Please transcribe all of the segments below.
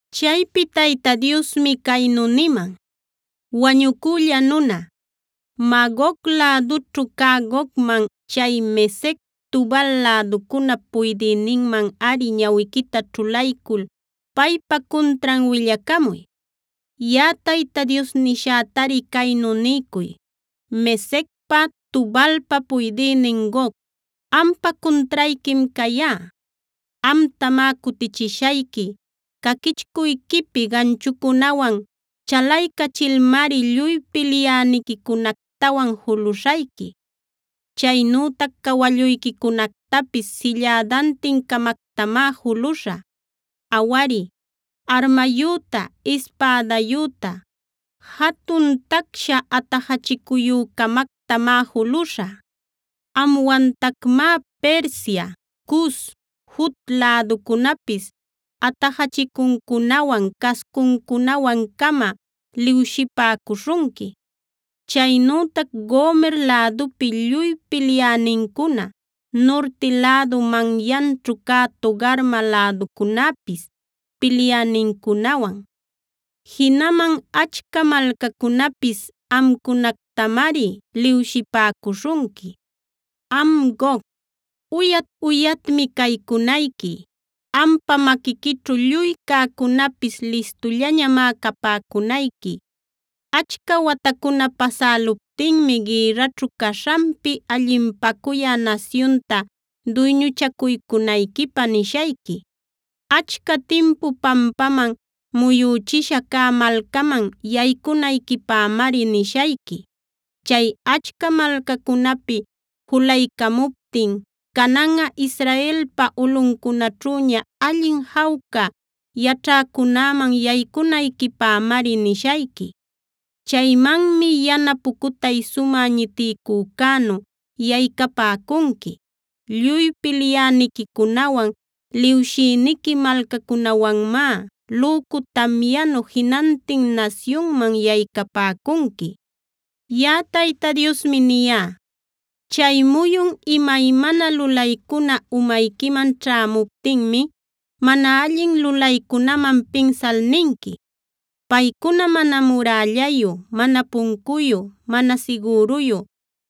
Chaypi Tayta Diosmi caynu niman: “Wañucülla nuna, Magog lädućhu cä Gogman, chay Mesec, Tubal läducunap puydïninmanꞌari ñawiquita ćhulaycul paypa cuntran willacamuy. Yaꞌa Tayta Dios nishätari caynu niycuy: ‘Mesecpa, Tubalpa puydïnin Gog, ampa cuntrayquim cayá. Amtamá cutichishayqui. Caquichcuyquipi ganchucunawan chalaycachilmari lluy pilyäniquicunactawan juluśhayqui. Chaynütac cawalluyquicunactapis sillädantin-camactamá juluśhä. Awari, armayüta, ispädayüta, jatun tacsha atajachicuyü-camactamá juluśhä. Amwantacmá Persia, Cus, Fut läducunäpis atajachicuncunawan, cascuncunawan-cama liwshipäcuśhunqui. Chaynütac Gomer lädupi lluy pilyänincuna, nurti lädup manyanćhu cä Togarma läducunäpis pilyänincunawan, jinaman achca malcacunapis amcunactamari liwshipäcuśhunqui. “ ‘Am Gog, uyat-uyatmi caycunayqui. Ampa maquiquićhu lluy cäcunäpis listullañamá capäcunayqui. Achca watacuna pasäluptinmi gïrraćhu caśhanpi allinpacuyä nasyunta duyñuchacuycunayquipä nishayqui. Achca timpu pampaman muyüchisha cä malcaman yaycunayquipämari nishayqui. Chay achca malcacunapi julaycamuptin cananꞌa Israelpa ulꞌuncunaćhüña allin jawca yaćhäcunäman yaycunayquipämari nishayqui. Chaymanmi yana pucutay sumä ñitiycücänu yaycapäcunqui. Lluy pilyäniquicunawan liwshïniqui malcacunawanmá lücu tamyanu jinantin nasyunman yaycapäcunqui. “ ‘Yaꞌa Tayta Diosmi niyá: Chay muyun imaymana lulaycuna umayquiman ćhämuptinmi mana allin lulaycunaman pinsal ninqui: “Paycuna mana murällayu, mana puncuyu, mana sigüruyu,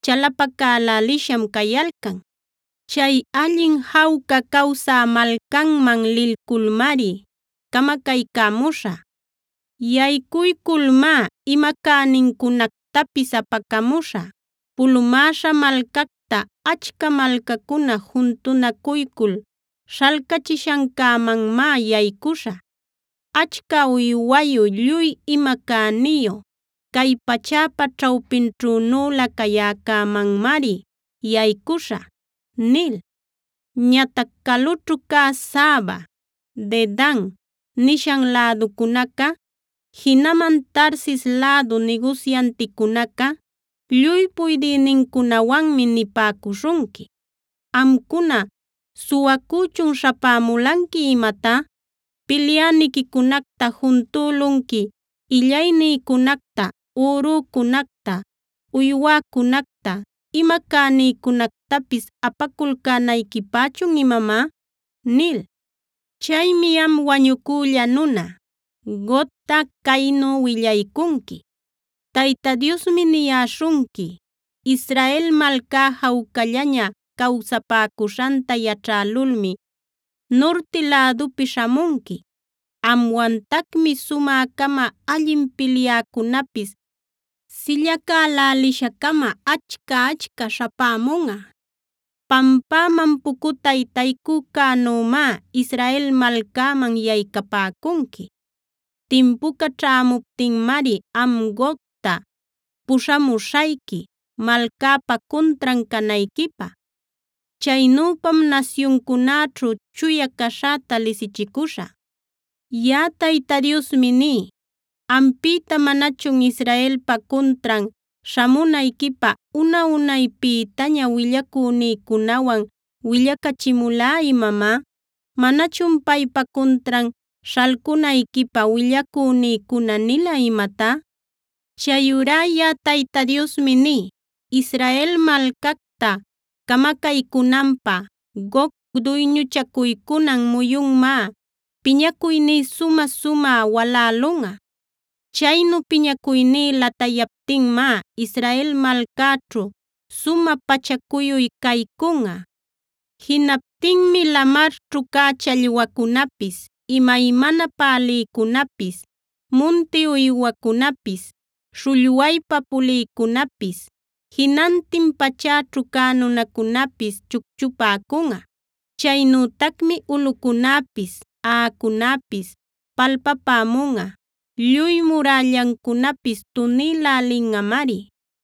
chalapacälälisham cayalcan. Chay allin jawca cawsä malcanman lilculmari camacaycämushä. Yaycuyculmá ima cänincunactapis apacamuśhä. Pulumäśha malcacta, achca malcacuna juntunacuycul śhalcachishancämanmá yaycüśhä. Achca uywayu, lluy ima cäniyu, cay pachäpa ćhawpinćhünülä cayäcämanmari yaycüśhä” nil. Ñatac calućhu cä Saba, Dedan nishan läducunaca, jinaman Tarsis lädu nigusyanticunaca lluy puydïnincunawanmi nipäcuśhunqui: “Amcuna, ¿suwacüchun śhapämulanqui imatá? ¿Pilyäniquicunacta juntülunqui illaynïcunacta, ürücunacta, uywäcunacta, ima cänïcunactapis apaculcänayquipächun imamá?” ’ nil. “Chaymi am wañucülla nuna, Gogta caynu willaycunqui: Tayta Diosmi niyäśhunqui: Israel malcá jawcallaña cawsapäcuśhanta yaćhälulmi, nurti lädupi śhamunqui. Amwantacmi sumä-cama allin pilyäcunapis sillacälälisha-cama achca-achca śhapämunꞌa. Pampäman pucutay taycücänümá Israel malcäman yaycapäcunqui. Timpuca ćhämuptinmari am Gogta puśhamuśhayqui malcäpa cuntran canayquipä. Chaynüpam nasyuncunäćhu chuya caśhäta lisichicuśhä. “Yaꞌa Tayta Diosmi ní: ¿Ampïta manachun Israelpa cuntran śhamunayquipä una-unaypïtaña willacünïcunawan willacachimulá imamá? ¿Manachun paypa cuntran śhalcunayquipä willacünïcuna nila imatá? “Chayurá yaꞌa Tayta Diosmi ní: Israel malcacta camacaycünanpä Gog duyñuchacuycunan muyunmá piñacuyní sumä-sumä walälunꞌa. Chaynu piñacuyní latayaptinmá Israel malcäćhu sumä pacha cuyuy caycunꞌa. Jinaptinmi lamarćhu cä challwacunapis, imaymana pälïcunapis, munti uywacunapis, śhullwaypa pulïcunapis, jinantin pachäćhu cä nunacunäpis chucchupäcunꞌa. Chaynütacmi ulꞌucunäpis, aꞌacunäpis palpapämunꞌa; lluy murällancunapis tunïlälinꞌamari.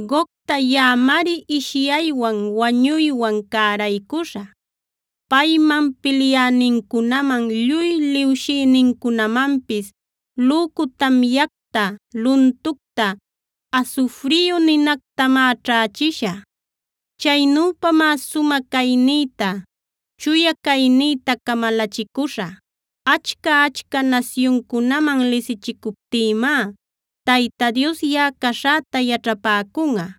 Gogta yaꞌamari ishyaywan, wañuywan cäraycuśhä. Payman, pilyänincunaman, lluy liwshïnincunamanpis lücu tamyacta, luntucta, asufriyu ninactamá ćhächishä. Chaynüpamá sumä caynïta, chuya caynïta camalachicuśhä. Achca-achca nasyuncunaman lisichicuptïmá Tayta Dios yaꞌa caśhäta yaćhapäcunꞌa.